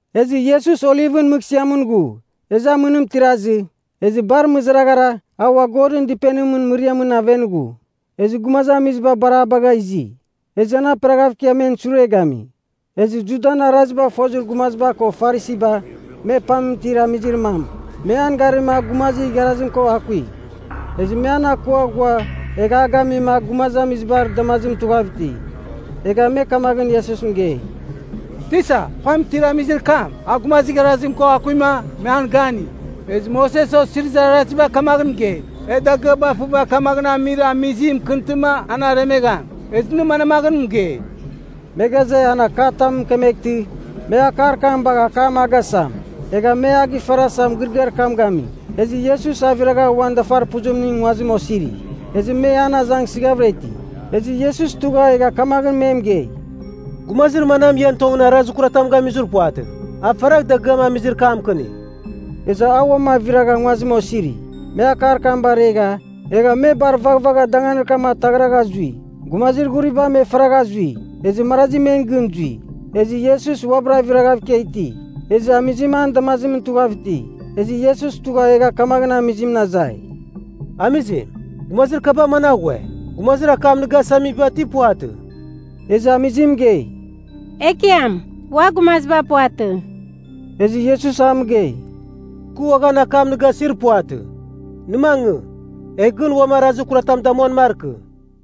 Ezɨ Iesus Olivɨn mɨghsɨamɨn ghu. Ezɨ amɨnim tirazɨ, ezɨ bar mɨzaraghara a ua Godɨn Dɨpenimɨn mɨriamɨn aven ghu. Ezɨ gumazamiziba bar a bagha izi. Ezɨ an aperaghav ikia men sure gami. Ezɨ Judan arazibagh fozir gumaziba ko Farisiba me pam itir amizir mam, me an garima a gumazir igharazim ko akui, ezɨ me an akua ghua egha a gamima a gumazamizibar damazimɨn tughav iti. Egha me kamaghɨn Iesus mɨgei, “Tisa, pam itir amizir kam, a gumazir igharazim ko akuima, me an gani. Ezɨ Moses Osirizir Araziba kamaghɨn mɨgei, e dagɨaba fɨva kamaghɨn amir amizim mɨkɨntɨma an aremegham. Ezɨ nɨ manmaghɨn mɨgei.” Me ghaze, an akatam mɨkemeghtɨ, me akar kam bagh akam a gasam. Egha me a gifarasa mɨgɨrɨgɨar kam gami. Ezɨ Iesus aviragha uan dafarpuzimɨn nguazim osiri. Ezɨ me an azangsɨghavɨra iti, ezɨ Iesus tugha egha kamaghɨn me mɨgei, “Gumazir manam ian tongɨn arazir kuratam gamizir puvatɨ, a faragh dagɨam amizir kam mɨkɨnigh.” Ezɨ a uam aviragha nguazimɨn osiri. Me akar kam baregha, egha me bar vaghvagha danganir kam ataghragha zui. Gumazir ghuriba me faragha zui, ezɨ marazi men gɨn zui. Ezɨ Iesus uabɨra aviragha ikia iti, ezɨ amizim an damazimɨn tughav iti. Ezɨ Iesus tugha egha kamaghɨn amizimɨn azai, “Amizim, gumazir kaba managh ghue? Gumazir akam nɨ gasamiba ti puvatɨ?” Ezɨ amizim mɨgei, “Ekiam, ua gumaziba puvatɨ.” Ezɨ Iesus a mɨgei, “Kɨ uaghan akam nɨ gasir puvatɨ. Nɨ mangɨ, egh gɨn uam arazir kuratam damuan markɨ.”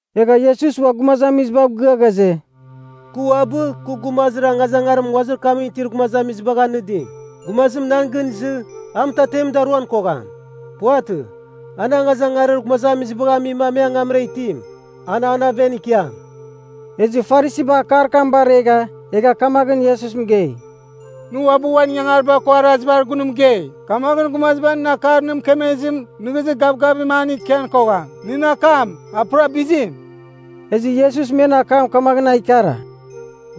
Egha Iesus ua gumazamizibav gɨa ghaze, “Kɨ uabɨ, kɨ gumazir angazangarim nguazir kamɨn itir gumazamizibagh anɨdim. Gumazim nan gɨn izɨ, a mɨtatemɨn daruan kogham. Puvatɨ. An angazangarir gumazamizibagh amima me angamra itim, an an aven ikiam.” Ezɨ Farisiba akar kam baregha egha kamaghɨn Iesus mɨgei, “Nɨ uabɨ uan ingangariba ko arazibar gun mɨgei. Kamaghɨn gumaziba nɨn akar nɨ mɨkemezim nɨghnɨzir gavgavim an ikian kogham. Nɨn akam, a pura bizim.” Ezɨ Iesus men akam kamaghɨn a ikara,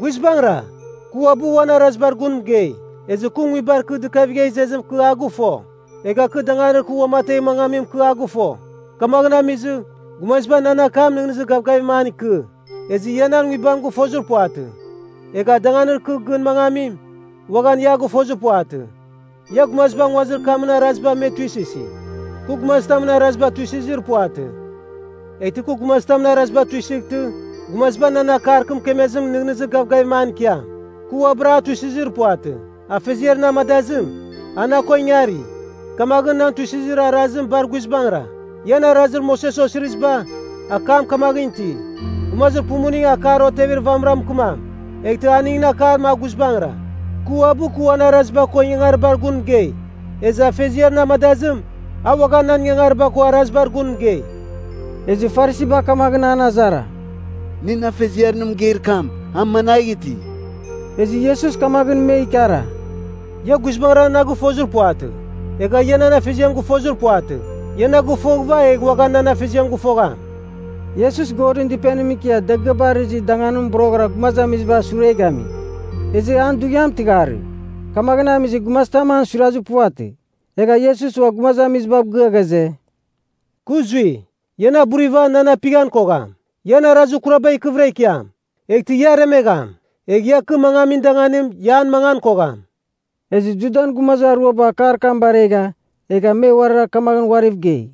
“Guizbangɨra, kɨ uabɨ uan arazibar gun mɨgei. Ezɨ kɨ nguibar kɨ dɨkavigha izezim kɨ a gɨfo, egha kɨ danganir kɨ uamategh mangamim, kɨ a gɨfo. Kamaghɨn amizɨ, gumaziba nan akam nɨghnɨzir gavgavim an ikɨ. Ezɨ ia nan nguibam gɨfozir puvatɨ. Egha danganir kɨ gɨn mangamim, uaghan ia a gɨfozir puvatɨ. Ia gumaziba nguazir kamɨn arazibar me tuisɨsi. Kɨ gumazitamɨn araziba tuisɨzir puvatɨ. Eghtɨ kɨ gumazitamɨn araziba tuisɨghtɨ, gumaziba nan akar kɨ mɨkemezim nɨghnɨzir gavgavim an ikiam. Kɨ uabɨra a tuisɨzir puvatɨ. Afeziar na amadazim, a na ko ingari, kamaghɨn nan tuisɨzir arazim bar guizbangɨra. Ian Arazir Moses Osiriziba, akam kamaghɨn iti, gumazir pumuning akar otevir vamɨra mɨkɨmam, eghtɨ aningɨn akam a guizbangɨra. Kɨ uabɨ kɨ uan araziba ko ingangaribar gun mɨgei, ezɨ Afeziar na amadazim, a uaghan nan ingangariba ko arazibar gun mɨgei.” Ezɨ Farisiba kamaghɨn an azara, “Nɨn Afeziar nɨ mɨgeir kam, a managh iti?” Ezɨ Iesus kamaghɨn me ikara, “Ia guizbangɨra na gɨfozir puvatɨ. Egha ia nan Afeziam gɨfozir puvatɨ. Ia na gɨfoghɨva egh uaghan nan Afeziam gɨfogham.” Iesus Godɨn Dɨpenimɨn ikia dagɨaba arɨzir danganimɨn boroghɨra gumazamizibar sure gami. Ezɨ an dughiam tɨgharɨ, kamaghɨn amizɨ gumazitam an suirazir puvatɨ. Egha Iesus ua gumazamizibav gɨa ghaze, “Kɨ zui. Ia na buriva nan apighan kogham. Ian arazir kuraba ikɨvɨra ikiam, eghtɨ ia aremegham. Egh ia kɨ mangamin danganim, ia an mangan kogham.” Ezɨ Judan gumazir aruaba akar kam baregha egha me uarira kamaghɨn uariv gei,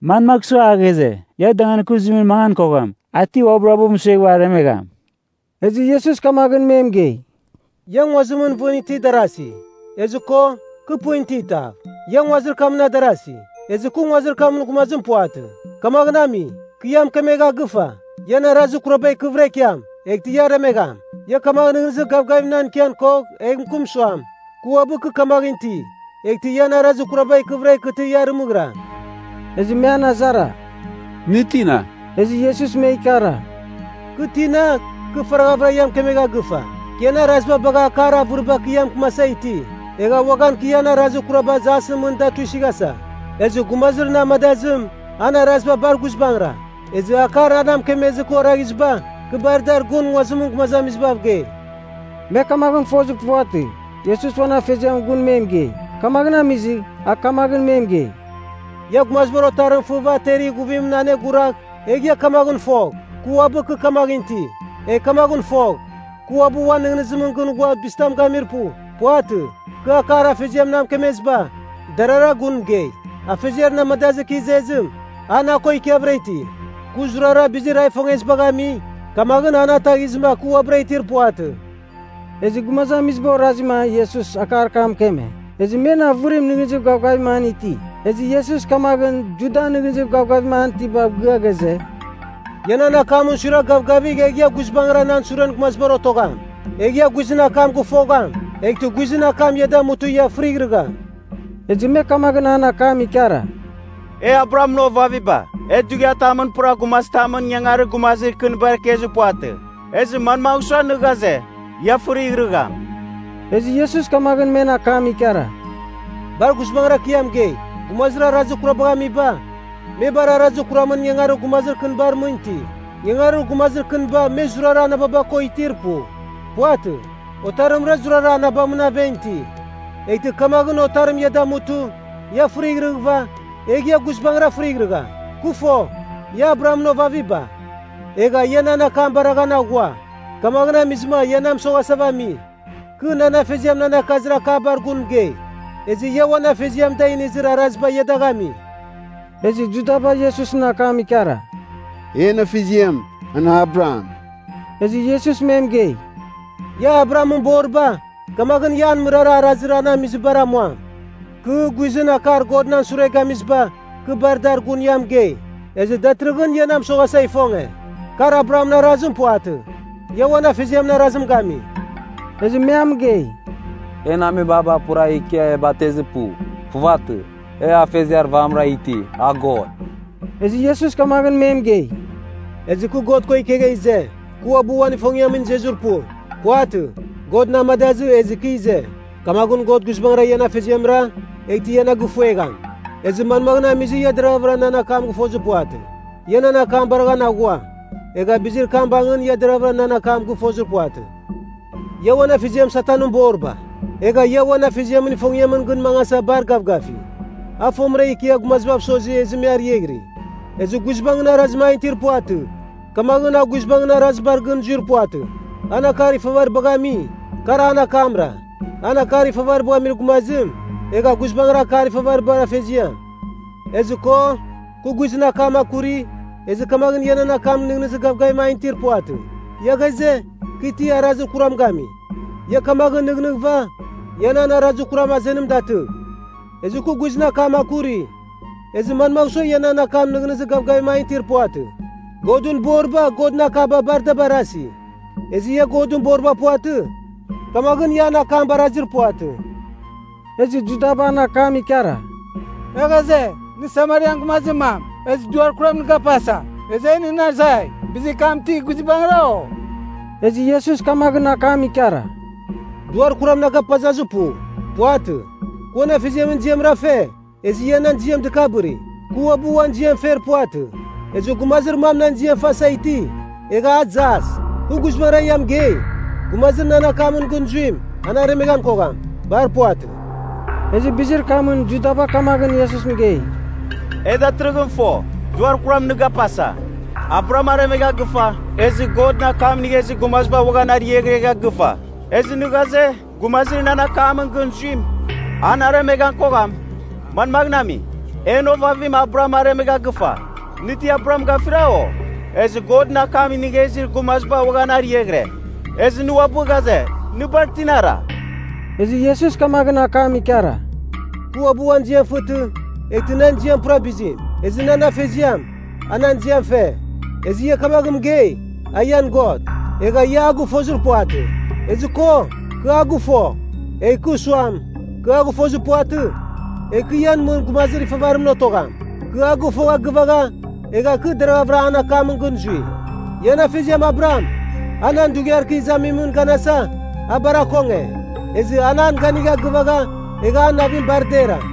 “Manmagh sua a ghaze, ‘Ia danganir kɨ zuimɨn mangan kogham?’ A ti uabɨra uabɨ mɨsueghɨva aremegham?” Ezɨ Iesus kamaghɨn me mɨgei, “Ia nguazimɨn vɨn itir darasi. Ezɨ ko, kɨ pɨn iti tav. Ia nguazir kamɨn adarasi. Ezɨ kɨ nguazir kamɨn gumazim puvatɨ. Kamaghɨn ami, kɨ ia mɨkemegha gɨfa, ian arazir kuraba ikɨvɨra ikiam, eghtɨ ia aremegham. Ia kamaghɨn nɨghnɨzir gavgavim nan ikian kogh egh mɨkɨm suam, Kɨ Uabɨ Kɨ Kamaghɨn Iti, eghtɨ ian arazir kuraba ikɨvɨra ikɨtɨ ia arɨmɨghiram.” Ezɨ me an azara, “Nɨ tina?” Ezɨ Iesus me ikara, “Kɨ tina, kɨ faraghavɨra ia mɨkemegha gɨfa. Kɨ ian araziba bagha akar avɨriba kɨ ia mɨkɨmasa iti. Egh uaghan kɨ ian arazir kuraba jasɨn mɨn da tuisɨghasa. Ezɨ gumazir na amadazim, an araziba bar guizbangɨra. Ezɨ akar a na mɨkemezɨ kɨ oraghiziba, kɨ bar dar gun nguazimɨn gumazamizibav gei.” Me kamaghɨn fozir puvatɨ, Iesus uan Afeziamɨn gun me mɨgei. Kamaghɨn amizɨ, a kamaghɨn me mɨgei, “Ia Gumazibar Otarim fɨva ter ighuvimɨn aneguragh, egh ia kamaghɨn fogh, Kɨ Uabɨ Kɨ Kamaghɨn Iti. Egh kamaghɨn fogh, kɨ uabɨ uan nɨghnɨzimɨn gɨn ghua bizitam gamir pu. Puvatɨ. Kɨ akar Afeziam na mɨkemeziba, darara gun mɨgei. Afeziar na amadazɨ kɨ izezim, a na ko ikiavɨra iti. Kɨ zurara bizir a ifongezibagh ami, kamaghɨn a na ataghizɨma kɨ uabɨra itir puvatɨ.” Ezɨ gumazamiziba orazima Iesus akar kam mɨkeme, ezɨ men avɨrim nɨghnɨzir gavgavim an iti. Ezɨ Iesus kamaghɨn Judan nɨghnɨzir gavgavim an itibav gɨa ghaze, “Ia nan akamɨn suiragh gavgavigh egh ia guizbangɨra nan suren gumazibar otogham. Egh ia guizɨn akam gɨfogham, eghtɨ guizɨn akam ia damutɨ ia fɨrighrɨgham.” Ezɨ me kamaghɨn an akam ikara, “E Abrahamɨn ovaviba. E dughiatamɨn pura gumazitamɨn ingangarir gumazir kɨnibar ikezir puvatɨ. Ezɨ manmagh sua nɨ ghaze, ‘Ia fɨrighrɨgham’?” Ezɨ Iesus kamaghɨn men akam ikara, “Bar guizbangɨra kɨ ia mɨgei, gumazir arazir kurabagh amiba, me bar arazir kuramɨn ingangarir gumazir kɨnibar mɨn iti. Ingangarir gumazir kɨniba me zurara anababa ko itir pu. Puvatɨ. Otarimra zurara anabamɨn aven iti. Eghtɨ kamaghɨn Otarim ia damutɨ, ia fɨrighrɨghɨva, egh ia guizbangɨra fɨrighrɨgham. Kɨ fo, ia Abrahamɨn ovaviba. Egha ia nan akam baraghan aghua, kamaghɨn amizɨma, ia na mɨsoghasava ami. Kɨ nan Afeziam nan akazir akabar gun mɨgei. Ezɨ ia uan afeziam da inizir araziba ia dagh ami.” Ezɨ Judaba Iesusɨn akam ikara, “En afeziam, an Abraham.” Ezɨ Iesus me mɨgei, “Ia Abrahamɨn boriba, kamaghɨn ia an mɨrara arazir an amizibar amuam. Kɨ, guizɨn akar God nan sure gamiziba, kɨ bar dar gun ia mɨgei. Ezɨ datɨrɨghɨn ia na mɨsoghasa ifonge. Kar Abrahamɨn arazim puvatɨ! Ia uan afeziamɨn arazim gami.” Ezɨ me a mɨgei, “En amebaba pura ikia e batezir pu. Puvatɨ. E afeziar vamɨra iti, a God.” Ezɨ Iesus kamaghɨn me mɨgei, “Ezɨ kɨ God ko ikegha ize. Kɨ uabɨ uan ifongiamɨn izezir pu. Puvatɨ. God na amadazɨ ezɨ ikɨ ize. Kamaghɨn God guizbangɨra ian Afeziamra, eghtɨ ia na gɨfuegham. Ezɨ manmaghɨn amizɨ ia deravɨra nan akam gɨfozir puvatɨ? Ia nan akam baraghan aghua, egha bizir kam bangɨn ia deravɨra nan akam gɨfozir puvatɨ. Ia uan afeziam Satanɨn boriba. Egha ia uan afeziamɨn ifongiamɨn gɨn mangasa bar gavgafi. A fomɨra ikia gumazibav sosi ezɨ me ariaghiri. Ezɨ guizbangɨn arazim an itir puvatɨ, kamaghɨn a guizbangɨn arazibar gɨn zuir puvatɨ. An akar ifavaribagh ami, kar an akamra. An akar ifavaribagh amir gumazim, egha guizbangɨra akar ifavaribar afeziam. Ezɨ ko, kɨ guizɨn akam akuri, ezɨ kamaghɨn ia nan akam nɨghnɨzir gavgavim an itir puvatɨ. Ia ghaze, kɨ ti arazir kuram gami? Ia kamaghɨn nɨghnɨghɨva, ia nan arazir kuram azenim datɨgh. Ezɨ kɨ guizɨn akam akuri, ezɨ manmagh sua ia nan akam nɨghnɨzir gavgavim an itir puvatɨ? Godɨn boriba Godɨn akaba bar da barasi. Ezɨ ia Godɨn boriba puvatɨ, kamaghɨn ia an akam barazir puvatɨ.” Ezɨ Judaba an akam ikara, “E ghaze, nɨ Samarian gumazir mam, ezɨ duar kuram nɨ gapasa. Ezɨ e nɨn azai, bizir kam ti guizbangɨra, o?” Ezɨ Iesus kamaghɨn akam ikara, “Duar kuram na gapazazir pu. Puvatɨ. Kɨ uan Afeziamɨn ziamra fe, ezɨ ia nan ziam dɨkabɨri. Kɨ uabɨ uan ziam fer puvatɨ. Ezɨ gumazir mam nan ziam fasa iti, egha a jas. Kɨ guizbangɨra ia mɨgei, gumazir nan akamɨn gɨn zuim, an aremeghan kogham. Bar puvatɨ.” Ezɨ bizir kamɨn Judaba kamaghɨn Iesus mɨgei, “E datɨrɨghɨn fo, duar kuram nɨ gapasa. Abraham aremegha gɨfa, ezɨ Godɨn akam inigha izir gumaziba uaghan ariaghregha gɨfa. Ezɨ nɨ ghaze, gumazir nan akamɨn gɨn zuim, an aremeghan kogham? Manmaghɨn ami? En ovavim Abraham aremegha gɨfa! Nɨ ti Abraham gafira, o? Ezɨ Godɨn akam inigha izir gumaziba uaghan ariaghɨre. Ezɨ nɨ uabɨ ghaze, nɨ bar tinara?” Ezɨ Iesus kamaghɨn akam ikara, “Kɨ uabɨ uan ziam fɨtɨ, eghtɨ nan ziam pura bizim. Ezɨ nan Afeziam, a nan ziam fe. Ezɨ ia kamaghɨn mɨgei, a ian God. Egha ia a gɨfozir puvatɨ. Ezɨ ko, kɨ a gɨfo. Egh kɨ suam, ‘Kɨ a gɨfozir puvatɨ,’ egh kɨ ian mɨn gumazir ifavarimɨn otogham. Kɨ a gɨfogha gɨvagha, egha kɨ deravɨra an akamɨn gɨn zui. “Ian afeziam Abraham, a nan dughiar kɨ izamimɨn ganasa, a bar akonge. Ezɨ an an ganigha gɨvagha, egha an navim bar dera.”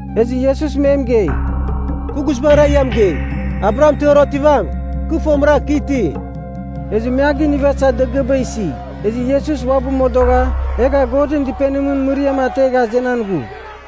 Ezɨ Iesus me mɨgei, “Kɨ guizbangɨra ia mɨgei, Abraham tɨghar otivam, kɨ fomɨra, Kɨ Iti.” Ezɨ me a ginivasa dagɨaba isi. Ezɨ Iesus uabɨ modogha egha Godɨn Dɨpenimɨn mɨriam ategha azenan ghu.